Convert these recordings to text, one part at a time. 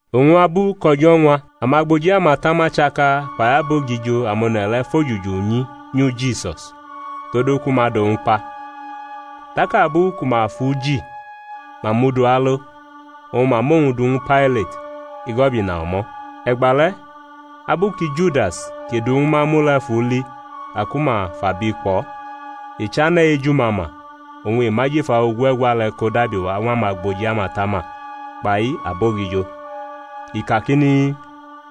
Oñ abu kʼo̩jo̩ ñwa, amagboji amatama chaka kpai abogijo amone̩ le̩ fʼojuju nyi nyu Jisus, todu ku ma dʼowñ kpa. Tak abu ku ma fʼu ji ma mʼu du alo, oñ ma mʼowñ du ñwu Pailat, igo̩bina o̩mo̩. E̩gba le̩ abu ki Judas kʼi dʼu ñwu ma mu le̩ fu li ka ku ma fʼabi kpʼo̩, i chane̩ ejumama oñ i mʼajifa ogue̩gwa le̩ ko dabiwa ñw amagboji amatama kpai abogijo, i kakini,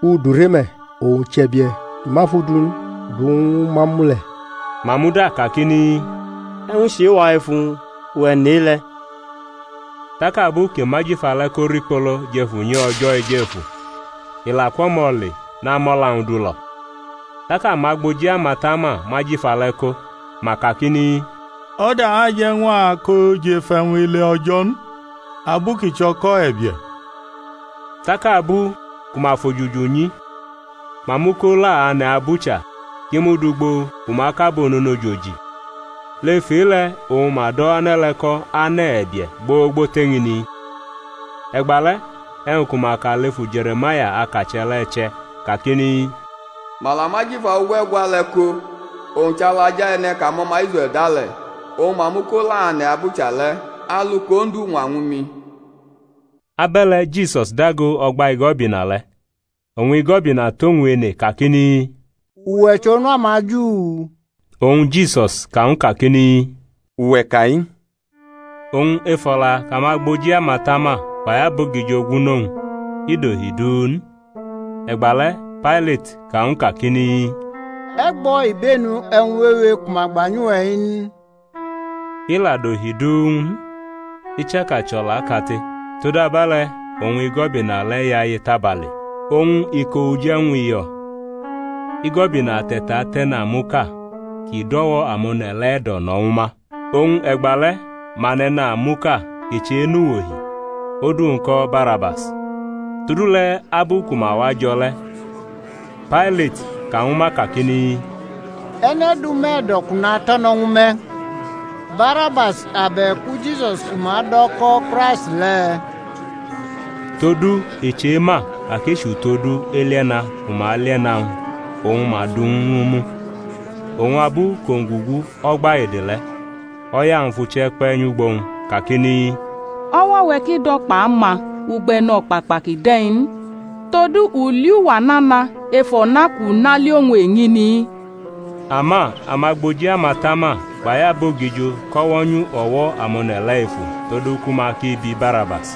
U dure me̩, owñ chʼe̩bie̩ ki ma fʼudu n kʼu du ñwu ma mu le̩. Ma muda kakini, E̩wñ chʼe-wa ef uwñ? Uwe̩ nʼe-le̩. Tak abu kʼi mʼajifa le̩ ko rikpolo jʼef unyi O̩jo̩ Ejefu, i la kwʼo̩mo̩ le namʼo̩la-wñ du lo̩. Tak amagboji amatama mʼajifa le̩ ko, ma kakini, O̩da aje̩ ñw a kʼo jʼef e̩wñ ele O̩jo̩ n, abu kʼi chʼo̩ko̩ e̩bie̩. Tak abu ku ma fʼojuju nyi, ma mʼu ko la ane̩ abucha kʼi mud ugbo ku ma kʼabo ononojo ji. Lef e-le̩ oñ ma do̩ ane̩ le̩ ko̩ Ane̩ E̩bie̩ gbogbo tʼeñini. E̩gba le̩ e̩wñ ku ma ka lefu Je̩re̩maya akache̩ le̩ che̩, kakini, Ma la mʼajifa ogue̩gwa le̩ ko, oñ chʼalaja e̩ne̩ kʼamo̩ma Israe̩l da le̩. Oñ ma mʼu ko la ane̩ abucha le̩, alu kʼOndu ñwa ñwu mi. Abe̩le̩ Jisus dago o̩gba igo̩bina le̩; oñ igo̩bina tʼowñ ene kakini, Uwe̩ chʼOnu amaJu? Oñ Jisus ka ñwu kakini, Uwe̩ ka-i. Oñ ef o̩la kʼamagboji amatama kpai abogijo gwu-nʼowñ i dohi du n. E̩gba le̩ Pailati ka ñw u kakini, E̩ gbo̩ ibenu e̩wñ wewe ku ma gba nyʼuwe̩ n? I la dohi du ñw u n, i chaka chʼo̩laʼkate. Todabe̩le̩ oñ igo̩bina le̩ yaye tabale. Oñ iko uje̩wñ uyo̩ igo̩bina te̩tatʼe̩namuʼka kʼi dʼo̩wo̩ amone̩ le̩ e̩do̩ no̩ ñwu ma. Oñ e̩gba le̩ ma nʼe̩namuʼka kʼi chenʼuwohi, odu-wñ ko̩ Barabas. Todule̩ abu ku ma wajo̩ le̩ Pailati ka ñwu ma kakini, E̩ne̩ dʼume̩ e̩do̩ kʼu nato̩no̩ ñwu me̩, Barabas abe̩ku Jisus ku ma do̩ ko̩ Kraisti le̩? Todu i chema ka kʼi chʼutodu elie̩na ku ma lie̩na-wñ oñ ma dʼuwñ ñw u mu. Oñ abu kʼowñ gugu o̩gba ede le̩, o̩ya-wñ fʼuche̩ kpe̩ nyʼugbo-wñ, kakini, O̩wo̩-we̩ ki do̩ kpʼama ugbo e̩no̩kpakpa ki de̩ n. Todu u li uwa nana ef o̩na kʼu na li owñ eñini. Ama amagboji amatama kpai abogijo kʼo̩wo̩ nyu o̩wo̩ amone̩ le̩ efu todu ku ma ki bi Barabas,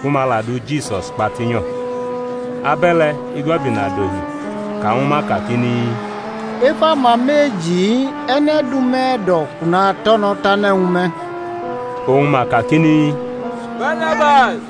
ku ma la du Jisus kpa tinyo̩. Abe̩le̩ igo̩bina dohi ka ñwu ma kakini, Ef ama meji-i e̩ne̩ dʼume̩ e̩do̩ kʼu nato̩no̩ tane̩ ñwu me̩? Oñ ma kakini, Barabas.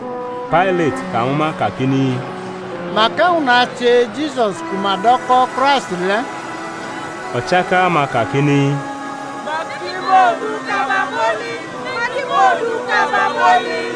Pailat ka ñwu ma kakini, Mak e̩wñ nache Jisus ku ma do̩ ko̩ Kraisti le̩? O̩chaka-ma kakini, Ma ki mʼowñ du kaba mʼoli.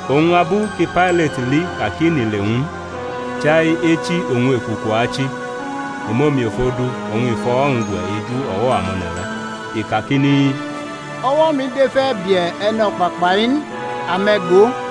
Oñ abu ki Pailati li ka ki nʼile ñw u n, chai echi oñ ekuku achi, i mʼomiofo du oñ i fʼo̩wo̩-wñ gwe̩ eju o̩wo̩ amone̩ le̩, i kakini, O̩wo̩-mi dʼef e̩bie̩ e̩no̩kpakpa-i n. Ame̩ go.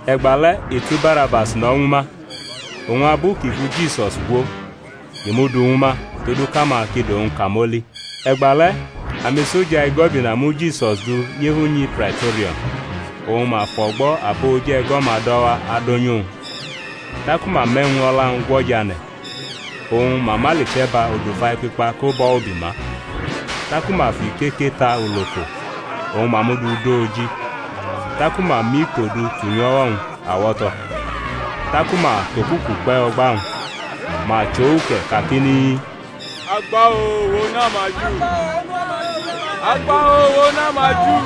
E̩gba le̩ i tu Barabas no̩ ñwu ma, oñ abu kʼi fu Jisus gwo, i mʼu du ñwu ma todu kʼama ki dʼowñ kamoli. E̩gba le̩ amisoja igo̩bina mu Jisus du nyʼef unyi Praito̩rium, oñ mafʼo̩gbo̩ abo oje̩go̩-ma do̩ wa adonyʼuwñ. Taku ma mʼe̩wñ o̩la-wñ gwo̩ jʼane̩, oñ ma mʼaliche̩ba odufa ekpikpa ko bʼo̩ ubi ma, taku ma fʼikeke ta uloko oñ ma mʼu du dʼo oji, taku ma mʼikpo du tunyʼo̩wo̩-wñ awo̩to̩, taku ma tʼokuku kpe̩ o̩gba-wñ, ma chʼo uke̩ kakini, Agba-oo, uwe̩, Onu amaJu.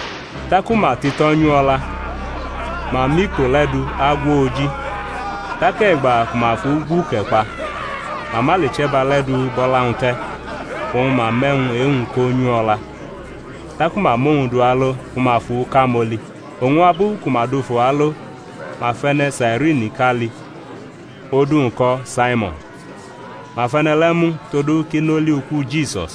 Taku ma tito̩ nyʼu o̩la, ma mʼikpo le̩ du agwʼo̩ oji. Tak e̩gba ku ma fʼu gwʼuke̩ kpa, ma mʼaliche̩ba le̩ du bʼo̩la-wñ te̩, oñ ma mʼe̩wñ e-wñ ko nyʼu o̩la. Taku ma mʼowñ du alo ku ma fʼu kamoli. Oñ abu ku ma dufu alo ma fʼe̩ne̩ Sairiniʼka li, odu-wñ ko̩ Saimon; ma fʼe̩ne̩ le̩ mu todu kʼi nʼoli uku Jisus.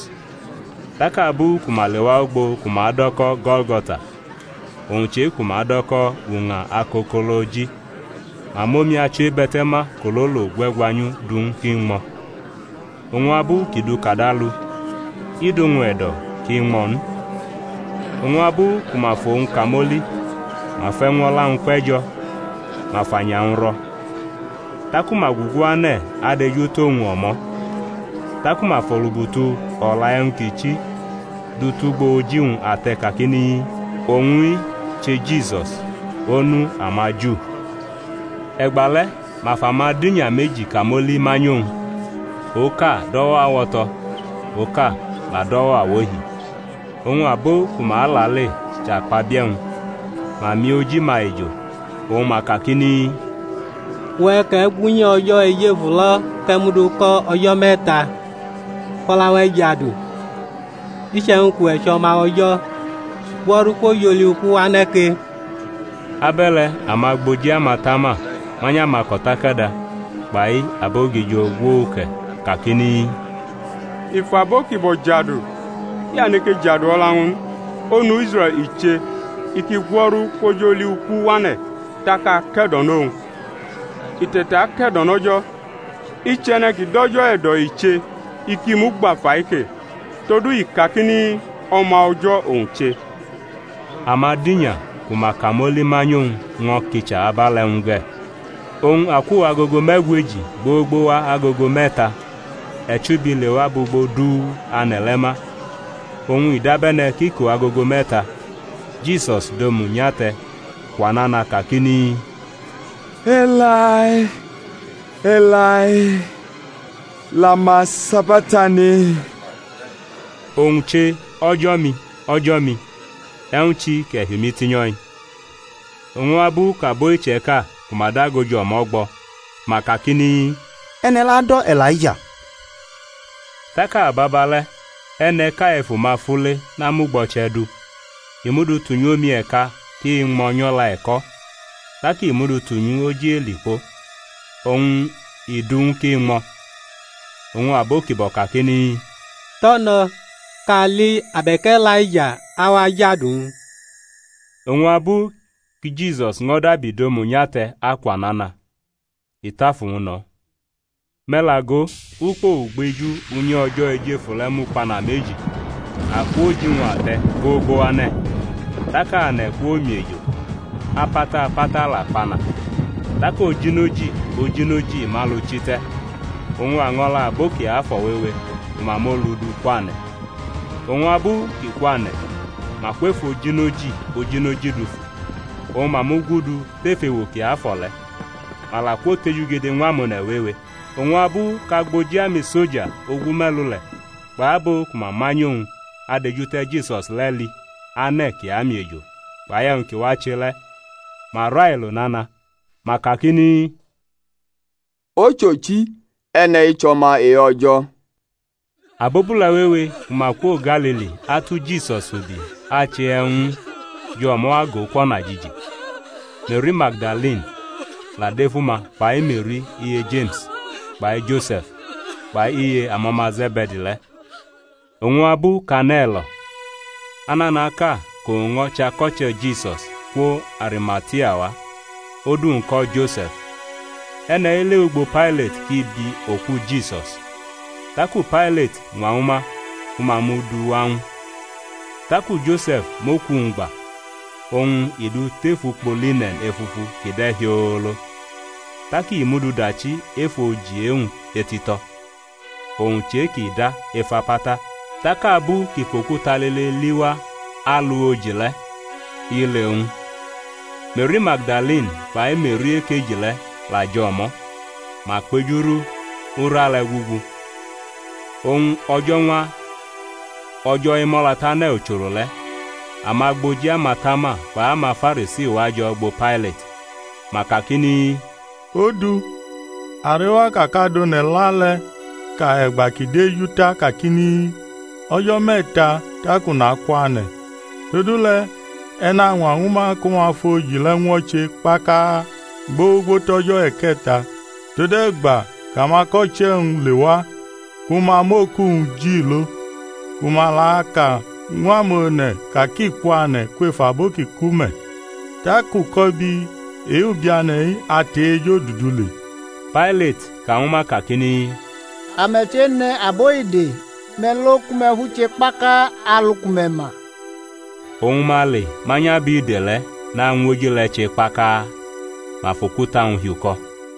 Tak abu ku ma lewa ugbo ku ma do̩ ko̩ Go̩lgo̩ta, owñ chʼe-ku ma do̩ ko̩ Uña Akokoloji, ma mʼomi achiwebe̩te̩ma kʼololo gwe̩gwa nyʼu du ñw u kʼi ñmo̩; oñ abu kʼi dʼu kadalu i dʼowñ e̩do̩ kʼi ñmo̩ n. Oñ abu ku ma fʼowñ kamoli ma fʼe̩wñ o̩la-wñ kpe̩ jo̩, ma fʼanya-wñ ro̩. Taku ma gugu ane̩ adejutʼowñ o̩mo̩. Taku ma fʼolubutu o̩la e̩wñ ki chi du tʼugbo oji-wñ ate̩ kakini: OWÑ-I CHE JISUS, ONU AMAJU. E̩gba le̩ ma fʼamadinya meji kamoli manyʼowñ, oka dʼo̩wo̩ awo̩to̩, oka la dʼo̩wo̩ awohi. Oñ abo ku ma alale chʼakpabie̩-wñ, ma miʼoji-ma ejo, oñ ma kakini, Uwe̩, kʼe̩ gu Unyi O̩jo̩ Ejefu lo̩ kʼe̩ mʼu du ko̩ o̩jo̩ me̩ta, fʼo̩la-we̩ jadu! Iche̩wñ kʼuwe̩ chʼO̩ma O̩jo̩, gwo̩ru kwʼoj oli uku wane̩ ke! Abe̩le̩ amagboji amatama manyʼamako̩takada kpai abogijo gwʼu uke̩, kakini, I fʼabo ki bo̩ jadu, i aneke jadu o̩la-wñ n; Onu Israe̩l i che, i ki gwo̩ru kwʼoj oli uku wane̩ tak a ake̩do̩nʼowñ. I te̩take̩do̩nʼO̩jo̩, i chʼe̩ne̩ ki dʼO̩jo̩ e̩do̩ i che, i ki mʼu gba fai ke, todu i ka kakini, O̩ma O̩jo̩ owñ che. Amadinya ku ma kamoli manyʼowñ ño̩ kicha abe̩le̩ ñw u ge̩. Oñ akwo agogo me̩gweji gbogbo wa agogo me̩ta e̩chubi lewa bʼugbo du ane̩ le̩ ma. Oñ i dabe̩ne̩ kʼiko agogo me̩ta Jisus dʼomu nyate̩ kwa nana kakini, Elai, Elai, lama sabaktani? Owñ che: O̩jo̩-mi, O̩jo̩-mi, e̩wñ chi kʼe̩ hi umi tinyo̩-i? Oñ abu kʼabo iche̩ka ku ma dago jʼo̩mo̩ gbʼo̩, ma kakini, E̩ne̩ le̩ ado̩ E̩laija. Tak ababa le̩ e̩ne̩ʼka ef uma fule namʼugbo̩che̩ du, i mʼu du tunyʼomi e̩ka kʼi ñmʼo̩ nyʼo̩la e̩ko̩, tak i mʼu du tunyʼoj elikpo, oñ i dʼu ñw u kʼi ñmʼe̩. Oñ abo ki bo̩ kakini, Tʼo̩ no̩, kʼa ali abe̩k Elaija awa jadu-wñ. Oñ abu ki Jisus ño̩ dabi dʼomu nyate̩ akwa nana, i tʼafu-wñ no̩. Me̩ la go, ukpo ugbeju Unyi O̩jo̩ Ejefu le̩ mukpana meji akwo oji-wñ ate̩ gbogbo wa ane̩; tak ane̩ kwomiejo, apata apata la kpana. Tak ojinoji ojinoji mʼalu chi te̩, oñ año̩la abo kiafo̩ wewe ku ma mʼolu du kwane̩; oñ abu kʼi kwane̩ ma kwʼef ojinoji ojinoji dufu, oñ ma mugudu tʼef ewo kiafo̩ le̩, ma la kwotejugede ñw amone̩ wewe. Oñ abu kʼagboji amisoja ogume̩lu le̩ kpai abo ku ma manyʼowñ adejute̩ Jisus le̩, li ane̩ ki amiejo kpai e̩wñ ki wache le̩, ma railo nana; ma kakini, Ochochi, e̩ne̩-i chʼỌma e-O̩jo̩. Abobule̩ wewe ku ma kwo Galili atu Jisus ubi ache e̩wñ ñw u jʼo̩mo̩ agʼo kwʼo̩najiji. Me̩ri Magdalini la dʼef uma kpai Me̩ri iye Jeme̩s kpai Jose̩f, kpai iye amo̩ma Ze̩be̩di le̩. Oñ abu kʼane̩ lo̩, ananaʼka kʼowñ ño̩ chʼako̩che̩ Jisus, kwo Arimatia wa; odu-wñ ko̩ Jose̩f. E̩ne̩-i lewʼugbo Pailati kʼi bi oku Jisus. Taku Pailati ñwa ñwu ma ku ma mʼu du wa ñw u. Taku Jose̩f mʼoku-wñ gba oñ i dʼu tef ukpo line̩n efufu ki de̩ hiolo, tak i mʼu du dachi ef oji e-wñ etito̩, owñ chʼe-kʼi da ef apata. Tak abu kʼi fʼokuta lile li wa alu oji le̩, i le owñ. Me̩ri Magdalini kpai Me̩ri ekeji le̩ la jʼo̩mo̩, ma kpejuru ura le̩ gugu. Oñ o̩jo̩ñwa O̩jo̩ Emʼo̩latane̩ ucholo le̩, amagboji amatama kpai amaFarisi wajo̩ ugbo Pailati. Ma kakini, Odu, a rewa ka kʼadone̩la le̩ ka e̩gba kʼi deju ta kakini, O̩jo̩ me̩ta tak u nakwane̩. Todule̩ e̩ nañwa ñwu ma ku ma fʼoji le̩ ñwo̩che kpaka gbogbo tʼo̩jo̩ e̩ke̩ta, tode̩gba kʼamako̩che̩-wñ lewa ku ma mʼoku-wñ ji lo, ku ma la aka ñw amone̩ ka kʼi kwane̩ kwef abo ki ku me̩. Tak uko̩bi e-ubiane̩-i atʼe-ejodudu le. Pailati ka ñwu ma kakini, Ame̩ chene̩ abo ide; me̩ lo ku me̩ fʼu che kpaka alu ku me̩ ma. Oñ ma le manyʼabide le̩ nañwʼoji le̩ che kpaka, ma fʼokuta-wñ hiuko̩.